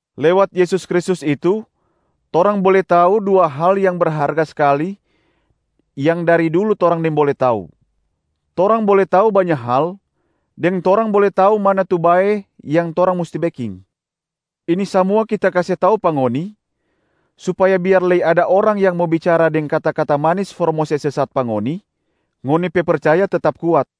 Lewat Yesus Kristus itu torang bole tau dua hal yang berharga skali yang dari dulu torang nimbole tau: torang bole tau banya hal deng torang bole tau mana tu bae yang torang musti beking. Ini samua kita kase tau pa ngoni supaya biar lei ada orang yang mo bicara deng kata-kata manis for mo se sesat pa ngoni, ngoni pe percaya tetap kuat.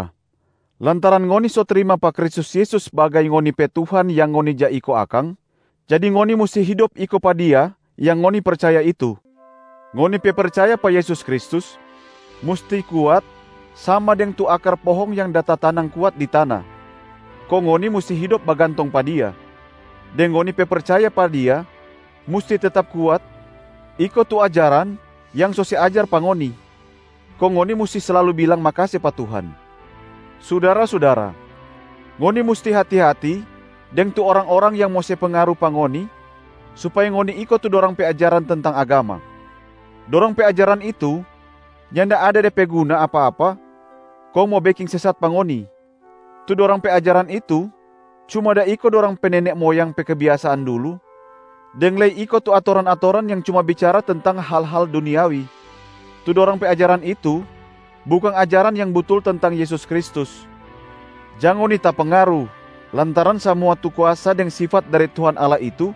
Sudara-sudara, lantaran ngoni so trima pa Kristus Yesus sbagai ngoni pe Tuhan yang ngoni ja iko akang, jadi ngoni musti hidop iko pa Dia yang ngoni percaya itu. Ngoni pe percaya pa Yesus Kristus musti kuat sama deng tu akar pohong yang da tatanang kuat di tana, kong ngoni musti hidop bagantong pa Dia. Deng ngoni pe percaya pa Dia musti tetap kuat iko tu ajaran yang so se ajar pa ngoni, kong ngoni musti slalu bilang makase pa Tuhan. Sudara-sudara, ngoni musti hati-hati deng tu orang-orang yang mo se pengaru pa ngoni supaya ngoni iko tu dorang pe ajaran tentang agama. Dorang pe ajaran itu nyanda ada de pe guna apa-apa kong mo beking sesat pa ngoni. Tu dorang pe ajaran itu cuma da iko dorang pe nene moyang pe kebiasaan dulu deng lei iko tu atoran-atoran yang cuma bicara tentang hal-hal duniawi, tu dorang pe ajaran itu bukang ajaran yang butul tentang Yesus Kristus. Jang ngoni tapengaru lantaran samua tu kuasa deng sifat dari Tuhan Allah itu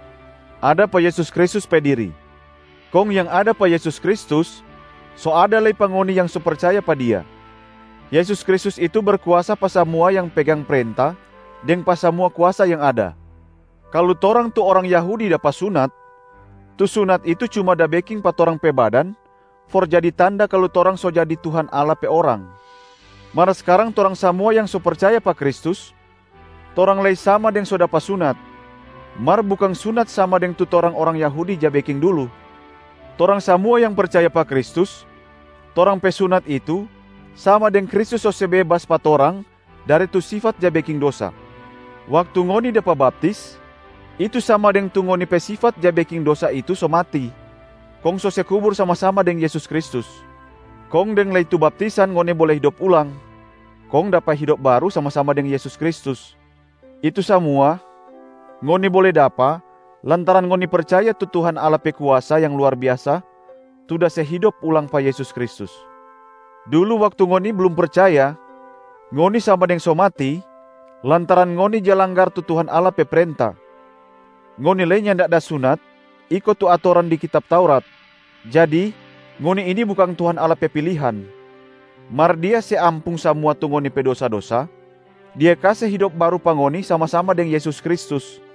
ada pa Yesus Kristus pe diri. Kong yang ada pa Yesus Kristus so ada lei pa ngoni yang so percaya pa Dia. Yesus Kristus itu berkuasa pa samua yang pegang prenta deng pa samua kuasa yang ada. Kalu torang tu orang Yahudi dapa sunat, tu sunat itu cuma da beking pa torang pe badan for jadi tanda kalu torang so jadi Tuhan Allah pe orang. Mar skarang torang samua yang so percaya pa Kristus, torang lei sama deng so dapa sunat, mar bukang sunat sama deng tu torang orang Yahudi ja beking dulu. Torang samua yang percaya pa Kristus, torang pe sunat itu sama deng Kristus so se bebas pa torang dari tu sifat ja beking dosa. Waktu ngoni dapa baptis, itu sama deng tu ngoni pe sifat ja beking dosa itu so mati kong so se kubur sama-sama deng Yesus Kristus. Kong deng lei tu baptisan ngoni bole hidop ulang kong dapa hidop baru sama-sama deng Yesus Kristus. Itu samua ngoni bole dapa lantaran ngoni percaya tu Tuhan Allah pe kuasa yang luar biasa tu da se hidop ulang pa Yesus Kristus. Dulu waktu ngoni blum percaya, ngoni sama deng so mati lantaran ngoni ja langgar tu Tuhan Allah pe prenta, ngoni lei nyanda da sunat iko tu atoran di kitab Taurat, jadi ngoni ini bukang Tuhan Allah pe pilihan. Mar Dia se ampung samua tu ngoni pe dosa-dosa, Dia kase hidop baru pa ngoni sama-sama deng Yesus Kristus.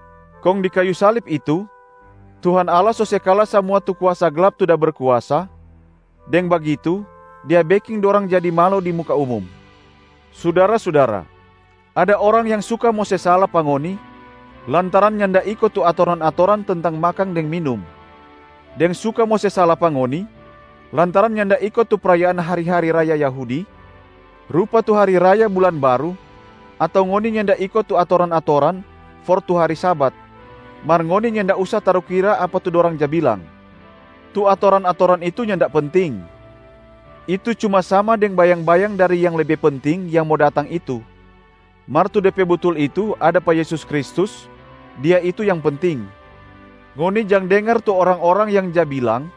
Kong di kayu salib itu Tuhan Allah so se kala samua tu kuasa glap tu da berkuasa, deng bagitu Dia beking dorang jadi malo di muka umum. Sudara-sudara, ada orang yang suka mo se sala pa ngoni lantaran nyanda iko tu atoran-atoran tentang makang deng minum, deng suka mo se sala pa ngoni lantaran nyanda iko tu prayaan hari-hari raya Yahudi, rupa tu hari raya bulan baru ato ngoni nyanda iko tu atoran-atoran for tu hari Sabat. Mar ngoni nyanda usa tarukira apa tu dorang ja bilang. Tu atoran-atoran itu nyanda penting, itu cuma sama deng bayang-bayang dari yang lebe penting yang mo datang itu, mar tu de pe butul itu ada pa Yesus Kristus, Dia itu yang penting. Ngoni jang dengar tu orang-orang yang ja bilang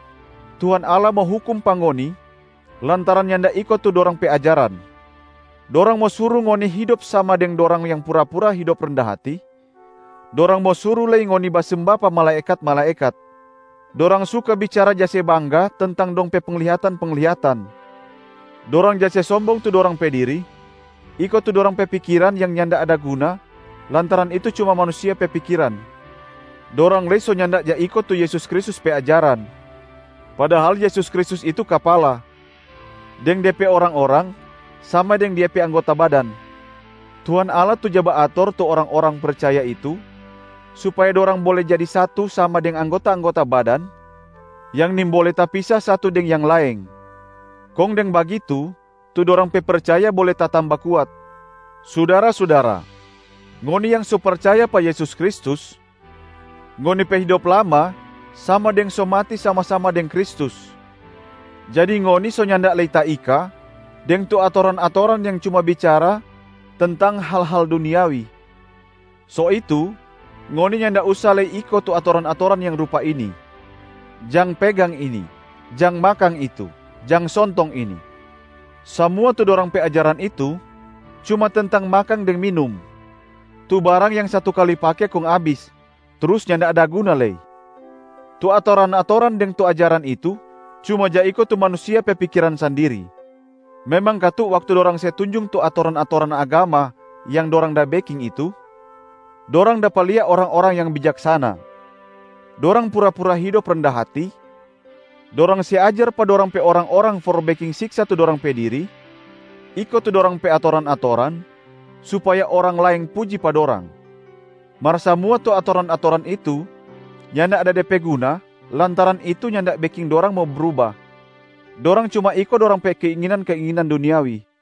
Tuhan Allah mo hukum pa ngoni lantaran nyanda iko tu dorang pe ajaran. Dorang mo suru ngoni hidop sama deng dorang yang pura-pura hidop renda hati, dorang mo suru lei ngoni basemba pa malaekat-malaekat. Dorang suka bicara ja se bangga tentang dong pe penglihatan-penglihatan. Dorang ja se sombong tu dorang pe diri iko tu dorang pe pikiran yang nyanda ada guna lantaran itu cuma manusia pe pikiran. Dorang lei so nyanda ja iko tu Yesus Kristus pe ajaran, padahal Yesus Kristus itu Kapala, deng De pe orang-orang sama deng Dia pe anggota badan. Tuhan Allah tu ja baator tu orang-orang percaya itu supaya dorang bole jadi satu sama deng anggota-anggota badan yang nimbole tapisa satu deng yang laeng, kong deng bagitu tu dorang pe percaya bole tatamba kuat. Sudara-sudara, ngoni yang so percaya pa Yesus Kristus, ngoni pe hidop lama sama deng so mati sama-sama deng Kristus, jadi ngoni so nyanda lei taika deng tu atoran-atoran yang cuma bicara tentang hal-hal duniawi. So itu, ngoni nyanda usa lei iko tu atoran-atoran yang rupa ini: “Jang pegang ini”, “Jang makang itu”, “Jang sontong ini”. Samua tu dorang pe ajaran itu cuma tentang makang deng minum, tu barang yang satu kali pake kong abis, trus nyanda ada guna lei. Tu atoran-atoran deng tu ajaran itu cuma ja iko tu manusia pe pikiran sandiri. Memang katu waktu dorang se tunjung tu atoran-atoran agama yang dorang da beking itu, dorang dapa lia orang-orang yang bijaksana. Dorang pura-pura hidop renda hati, dorang se ajar pa dorang pe orang-orang for beking siksa tu dorang pe diri iko tu dorang pe atoran-atoran supaya orang laeng puji pa dorang. Mar samua tu atoran-atoran itu nyanda ada de pe guna lantaran itu nyanda beking dorang mo bruba, dorang cuma iko dorang pe keinginan-keinginan duniawi.